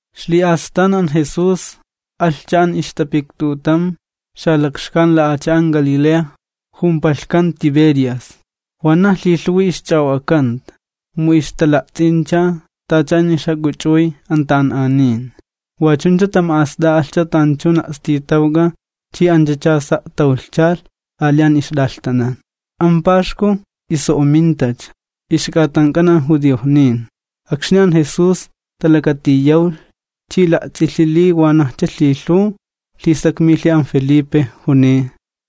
Ixli'astan, an Jesús alhcha an ixtapiktutam ay xalakxkan Galilea, jumpalhkan Tiberias. Wanaj lhilhuwi ixch'a'o'akanta, mu ixtala'ts'incha tacha an ixjak'uch'uy an ta'an'anin. Wa chuncha tama'ast'a'alhcha tanchun a'stitawk'a chi anchacha sa' tawlhchalh ali an ixt'alhtanan. An Paxku iso'omintacha, ixk'atank'an an judiojnin. Akxni an Jesús talakatiyawlh chi la'ts'ilhi li wanajcha lhilhuw, lhisakmilhi an Felipe, juniy: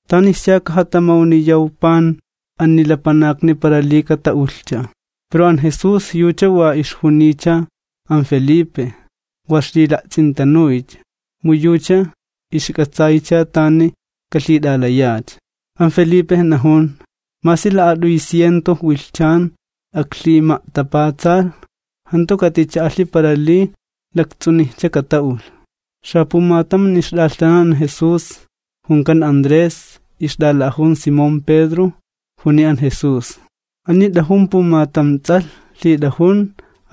―¿Tanischa kajatamawniyaw pan ani lapanakni para li kata'ulhcha? Pero an Jesús yucha wa ixjuniycha an Felipe, wa ixlila'ts'intanuycha, mu yucha ixk'atsaycha tani kalhit'alayacha. An Felipe najun: ―Masi la'at'uy ciento wilhchan aklhima'tapatsalh jantu katicha'alhi para li lakts'unijcha kata'ulh. Xapumatam an ixt'alhtanan an Jesús, junkan Andrés, ixt'ala'ajun Simón Pedro, juniy an Jesús: ―Ani t'ajun pumatam ts'alh lhit'ajun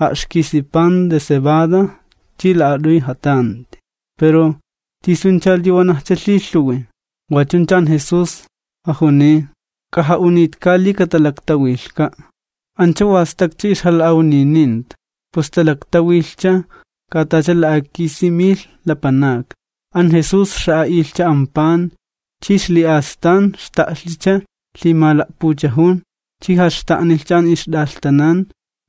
a'xkisi pan de cebada chi la'at'uy jatanti, pero, ¿tisuncha li wanajcha lhilhuwi? Wa chuncha an Jesús jajuniy: ―K'aja'unitka li katalaktawilhka'. Ancha wa stakcha ixjala'awnininta, pus talaktawilhcha, katacha la'akisi milh lapanakni. An Jesús xa'a'ilhcha an pan, chi ixli'astan xta'lhicha lhimala'puchajun, chi jaxta'nilhcha an ixt'alhtanan.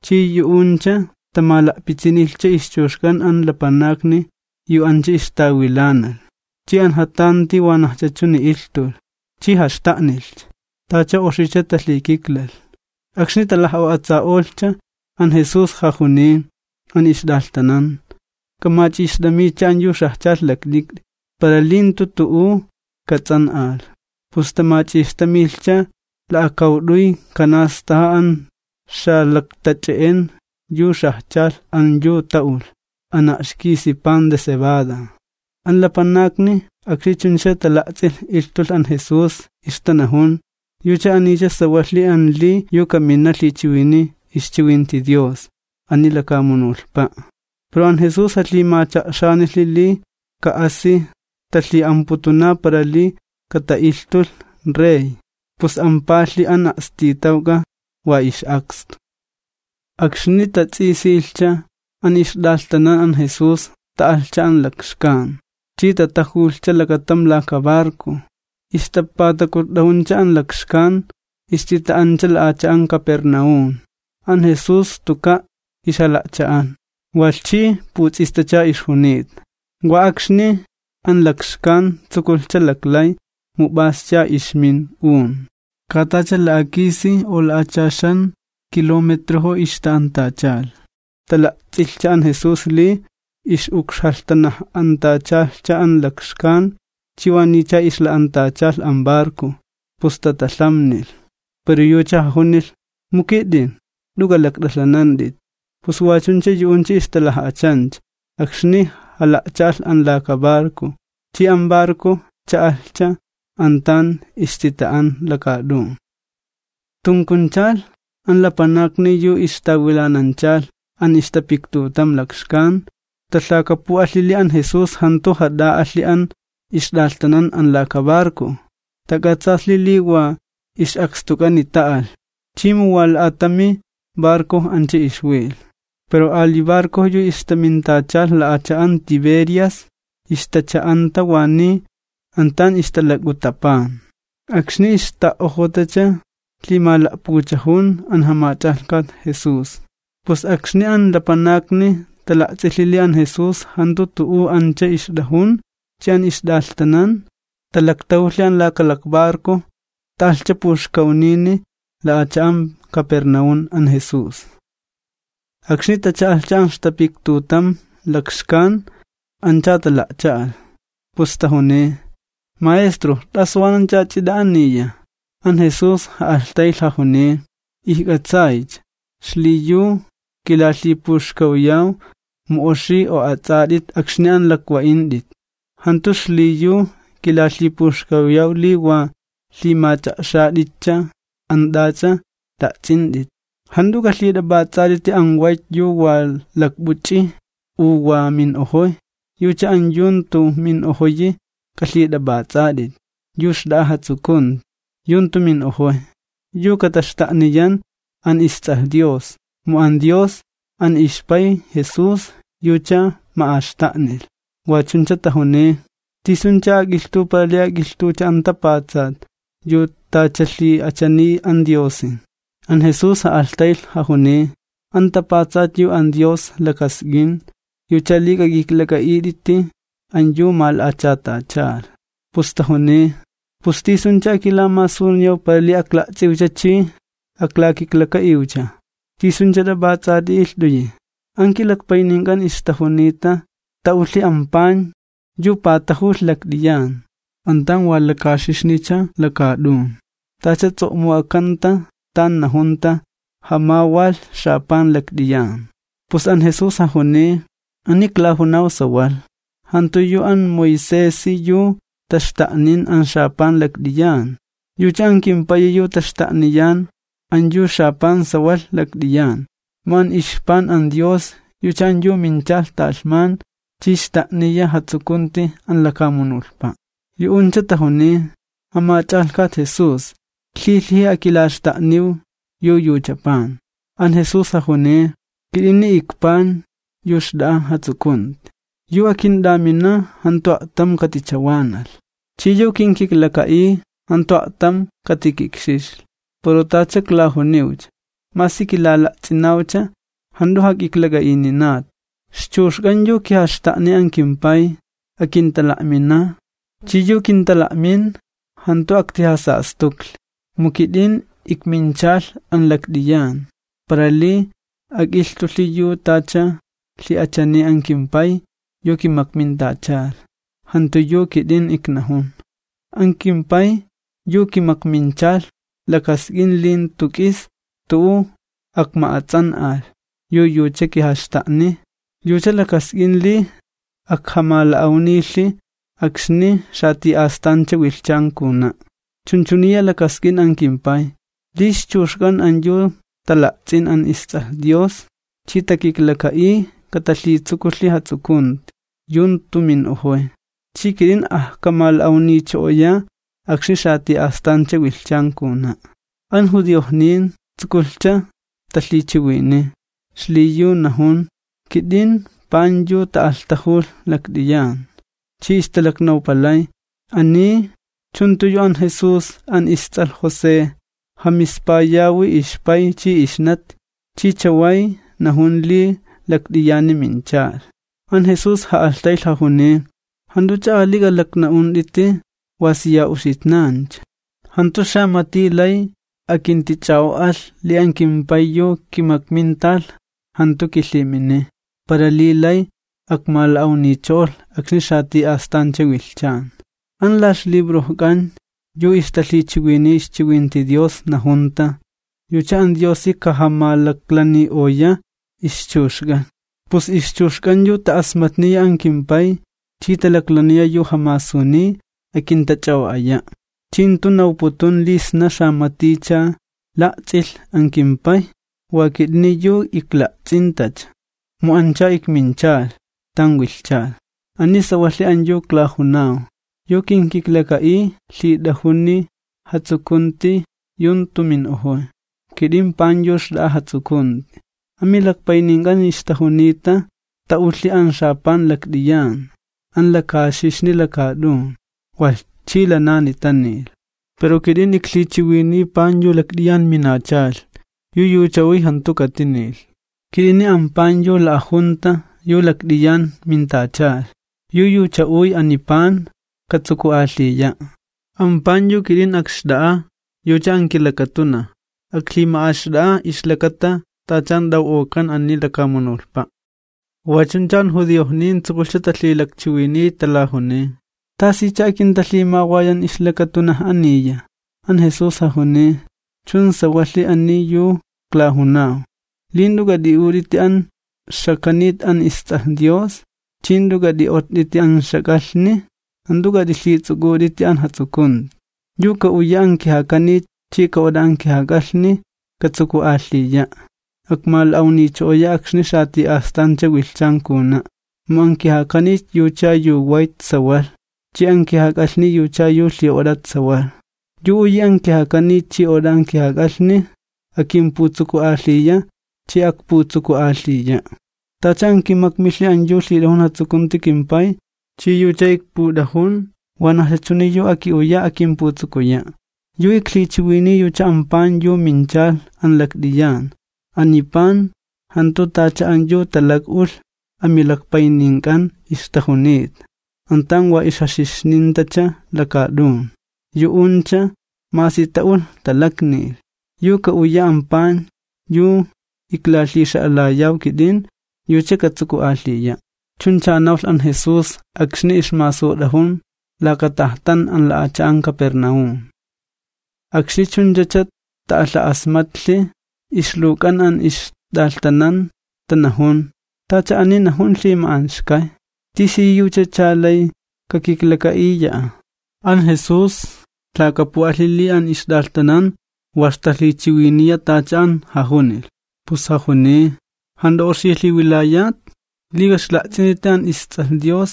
Chi yu'uncha tamala'pitsinilhcha ixchuxk'an an lapanakni yu ancha ixtawilanalh, chi an jatanti wanajcha chuni ilhtulh, chi jaxta'nilhcha, tacha oxicha talhikiklalh. Akxni talaj'o'atsa'olhcha, an Jesús jajuniy an ixt'alhtanan: ―K'amach'ixt'amitcha an yu xajchalh lakt'ikt'i, para li jantu tu'u kats'an'alh. Pus tamach'ixtamilhcha, la'akawt'uy kanastaja an xala'tach'e'en yu xajchalh an yu ta'ulh an a'xkisi pan de cebada. An lapanakni akxni chunchacha tala'ts'ilh ilhtulh an Jesús, ixtanajun: ―Yucha anicha sawalhi an li yu kamina lhichiwiniy ixchiwinti Dios ani lakamunulhpa'. Pero an Jesús jalhimacha'xanilhi li ka'asi talhi'amputuna para li kata'ilhtulh rey, pus ampalhi an a'stitawk'a wa ix'akstu. Akxni tats'isilhcha, an ixt'alhtanan an Jesús ta'alhcha an lakxkan, chi tatajulhcha lakatam laka barco, ixtapatakutt'ajuncha an lakxkan, ixtita'ancha la'acha'an Capernaúm. An Jesús tuka' ixjala'cha'an, walh chi puts'istacha ixjunita. Wa akxni an lakxkan tsukulhcha laklay, mu p'ascha ixmin un. Katacha la'akisicha u la'achaxancha kilometrojo ixta'antachalh, tala'ts'ilhcha an Jesús li ix'ukxjalhtanaj'antachalhcha an lakxkan chi waniycha ixla'antachalh an barco, pus tatalhamnilh. Pero yucha jajunilh: ―¡Mu kit'in, jant'u k'alakt'alhanant'it! Pus wa chuncha yu'uncha ixtalaj'achancha akxni jala'cha'alh an laka barco, chi an barco cha'alhcha an tan ixtita'an lakaat'un. Tunkunchalh, an lapanakni yu ixtawilananchalh an ixtapiktutam lakxkan, talhakapu'alhi li an Jesús jantu jat'a'alhi an ixt'alhtanan an laka barco, tak'atsaalhi li wa ix'akstuk'ani ta'alh chi mu wa la'ata'mi barco ancha ixwilh. Pero ali barco yu ixtamintachalh la'acha'an Tiberias, ixtacha'anta waniy an tan ixtalak'uta pan, akxni ixta'ojotacha lhimala'puchajun an jamach'alhkat Jesús. Pus akxni an lapanakni tala'ts'ilhi li an Jesús jantu tu'u ancha ixt'ajun, chi an ixt'alhtanan, talaktajulhi an laka lakbarco ta'alhcha puxkawnini la'acha'an Capernaúm an Jesús. Akxni tacha'alhcha an ixtapiktutam lakxkan ancha tala'cha'alh, pus tajuniy: ―Maestro, ¿t'asu wananch'a ch'it'a ani? An Jesús ja'alhtaylh jajuniy: ―Ijk'atsaycha, xliyu kilalhipuxkawyaw mu oxi o'ats'at'it akxni an lakwa'int'it, jantu xliyu kilalhipuxkawyaw li wa lhimach'a'xat'itcha an t'ach'a la'ts'int'it. Jant'u k'alhit'ap'ats'at'iti an wayt yu wa lakp'uch'iy u wa min'ojoy. Yucha an yu jantu min'ojoyi k'alhit'ap'ats'at'it, yu xt'a'a jatsukunti yu jantu min'ojoy, yu iklaxta'niyaw kit'in yu ikwalh isTs'alh Lapanak, mu an Dios, an kimPay yucha kisakxtulh. Wa chuncha tajuniy: ―¿Tisuncha ak'ilhtuw para li ak'ilhtuwcha an tapatsat yu tacha lhi'achaniy an Diosi? An Jesús ja'alhtaylh jajuniy: ―An tapatsat yu an Dios lakask'in, yucha li k'ak'iklak'a'it'iti an yu mala'achatachalh. Pus tajuniy: ―¿Pus tisuncha akilamasuniyaw para li akla'ts'iwcha chi aklakiklaka'iwcha? ¿Tisuncha tapatsati ilht'uyi? An kilakpaynink'an ixtajunita ta'ulhi an pan yu patajulh lakt'iyan an tan wa lakaxixnicha lakaat'un, tacha ts'o'muk'akanta tan najunta: “Jamawalh xapan lakt'iyan.” Pus an Jesús jajuniy: ―Ani klajunaw sawalh, jantu yu an Moisesi yu taxta'nin an xapan lakt'iyan, yucha an kimPayi yu taxta'niyan an yu xapan sawalh lakt'iyan. Mu an ixpan an Dios yucha an yu minchalh talhman chi xta'niya jatsukunti an lakamunulhpa'. Yu'uncha tajuniy: ―Jamach'alhkat Jesús, lhilhiji akilaxta'niw yu yucha pan. An Jesús jajuniy: ―Kit'ini ikpan yu xt'a'a jatsukunti. Yu akint'amina jantu a'tam katichawanalh, chi yu kinkiklaka'iy jantu a'tam katikikxixli. Pero tacha iklajuniwcha, masi kilala'ts'inawcha jant'u jak'iklak'a'ininat. Ixchuxk'an yu kijaxta'niy an kimPay, akintala'mina', chi yu kintala'min jantu aktijasastuklhi. Mu kit'in ikminchalh an lakt'iyan para li ak'ilhtulhi yu tacha lhi'achaniy an kimPay yu kimakmintachalh, jantu yu kit'in iknajun. An kimPay yu kimakminchalh lakask'in li jantu k'is tu'u akma'ats'an'alh yu yucha kijaxta'niy, yucha lakask'in li ajkamala'awnilhi akxni xati'astancha wilhchan kajuna'. Chunchuniya lakask'in an kimPay, li ixchuxk'an an yu tala'ts'in an isTs'alh Dios chi takiklaka'iy, katalhitsukulhi jatsukunti yu jantu min'ojoy. Chi kit'in ajkamala'awnicho'oya akxni xati'astancha wilhchan kajuna'. An judiojnin tsukulhcha talhichiwiniy, xliyu najun: “Kit'in ikpan yu ta'alhtajulh lakt'iyan”, chi ixtalaknawpalay: ―Ani, ¿chun jantu yu an Jesús an ists'alh José? Jamispayawi ixpay chi ixnati. Chi chaway najun li lakt'iyani minchalh. An Jesús ja'alhtaylh jajuniy: ―Jant'uch'a ali k'alakna'unt'iti tu'u wa siya uxitnancha. Jantu xamati lay akintich'a'o'alh li an kimPay yu kimakmintalh jantu kilhiminiy, para li lay akmala'awnicho'olh akxni xati'astancha wilhchan. An la ixlibrojk'an yu ixtalhichiwiniy ixchiwinti Dios najunta: “Yucha an Diosi kajamalaklani'oya ixchuxk'an.” Pus ixchuxk'an yu ta'asmatniya an kimPay chi talaklaniya yu jamasuniy, akintach'a'o'aya'. ’Chi jantu nawputun li sna xamaticha la'ts'ilh an kimPay, wa kit'ini yu ikla'ts'intacha, mu ancha ikminchalh tan wilhchalh. Ani sawalhi an yu iklajunaw, yu kinkiklaka'iy lhit'ajuni jatsukunti yu jantu min'ojoy. Kit'in ikpan yu xt'a'a jatsukunti. Amilakpaynink'an ixtajunita ta'ulhi an xapan lakt'iyan an lakaxixni lakaat'un, walh chi lanani tanilh. Pero kit'in iklhichiwiniy pan yu lakt'iyan minachalh, yu yucha uy, jantu katinilh. Kit'ini an pan yu la'ajunta yu lakt'iyan mintachalh. Yu yucha uy ani pan, katsuku'alhiya'. An pan yu kit'in akxt'a'a, yucha an kilakatunaj. Aklhima'axt'a'a ixlakata tacha an t'aw'ok'an ani lakamunulhpa'. Wa chuncha an judiojnin tsukulhcha talhilakchiwiniy, talajuniy: ―¿Tasicha akintalhimawayan ixlakatunaj aniya? An Jesús jajuniy: ―Chun sawalhi ani yu klajunaw, li jant'u k'at'i'ut'iti an ixjakanit an isTs'alh Lapanak ch'i jant'u k'at'i'ott'iti an ixjak'alhni, jant'u k'at'ilhits'uk'ut'iti an jatsukunti. Yu ka'uya an kijakanit chi ka'ot'a an kijak'alhni katsuku'alhiya', akmala'awnicho'oya akxni xati'astancha wilhchan kajuna'. Mu an kijakanit yucha yu wayt sawalh, chi an kijak'alhni yucha yu lhi'ot'at sawalh. Yu uyi an kijakanit chi ot'a an kijak'alhni akimputsuku'alhiya chi akputsuku'alhiya'. Tacha an kimakmilhi an yu lhit'ajun jatsukunti kimPay, chi yucha ikput'ajun, wanajcha chuni yu aki'uya akimputsukuya'. Yu iklhichiwiniy yucha an pan yu minchalh an lakt'iyan. Ani pan jantu tacha an yu talak'ulh amilakpaynink'an ixtajunita, an tan wa jaxixnintacha lakaat'un, yu'uncha masi ta'ulh talaknilh. Yu ka'uya an pan yu iklalhixa'alayaw kit'in, yucha katsuku'alhiya'. Chuncha nawlh an Jesús akxni ixmasut'ajun laka tajtan an la'acha'an Capernaúm. Akxni chunchacha ta'alha'asmatlhi, ixluwk'an an ixt'alhtanan tanajun: ―Tacha ani najun lhima'anxkay, ¿tisiyuchacha lay kakiklaka'iya'a? An Jesús lhakapu'alhi li an ixt'alhtanan wa ixtalhichiwiniya tacha an jajunilh, pus jajuniy: ―¿Jant'u oxi lhiwilayat? ¿Li k'a'ixla'ts'int'iti an isTs'alh Lapanak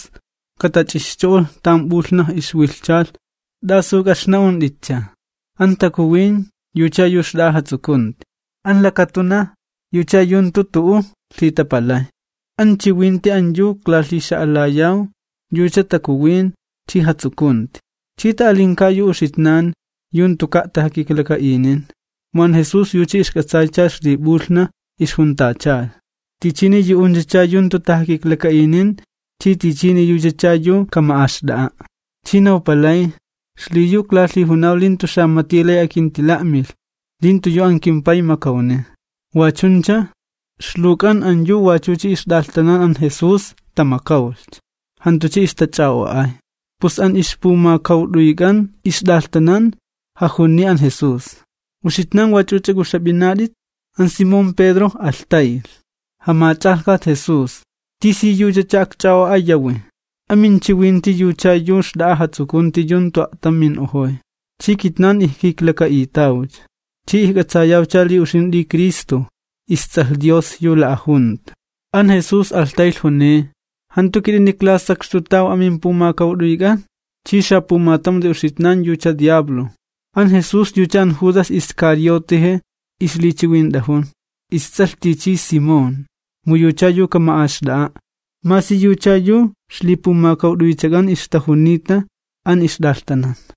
ka'ixtach'ixcho'olh tan p'ulhnaj ixwilhchalh, t'asu k'a'ixna'unt'itcha? An takuwin yucha yu xt'a'a jatsukunti, an lakatunaj yucha yu jantu tu'u lhitapalay. An chiwinti an yu iklalhixa'alayaw yucha takuwin chi jatsukunti. Chi ta'alinka yu uxitnan yu jantuka' tajakiklaka'inin. Mu an Jesús yucha ixk'atsaycha ixlip'ulhnaj ixjuntachalh, tichini yu'unchacha yu jantu tajakiklaka'inin, chi tichini yuchacha yu kama'axt'a'a'. Chi nawpalay: ―Xliyu iklalhijunaw li jantu xamati lay akintila'milh li jantu yu an kimPay makawniy. Wa chuncha, ixluwk'an an yu wachucha ixtat'alhtanan an Jesús tamakawlhcha, jantucha ixtach'a'o'ay. Pus an ixpumakawt'uyk'an ixt'alhtanan jajuniy an Jesús: ―¿Uxitnan wach'uch'a k'uxap'inat'it? An Simón Pedro alhtaylh: ―Jamach'alhkat Jesús, ¿tisiyuchacha akch'a'o'ayawi? Aminchiwinti yucha yu xt'a'a jatsukunti yu jantu a'tam min'ojoy. Chi kitnan ijkiklaka'itawcha, chi ijk'atsayawcha li uxint'i Cristo, isTs'alh Dios yu la'ajunta. An Jesús alhtaylh juniy: ―¿Jantu kit'ini iklasakxtutaw amimpumakawt'uyk'an? Walh chi xapumatam yu uxitnan yucha xapay makxkay'un. An Jesús yucha an Judas Iscarioteje ixlichiwint'ajun, ists'alh tichi Simón, mu yucha yu kama'axt'a'a', masi yucha yu ixlipumakawt'uychak'an ixtajunita an ixt'alhtanan.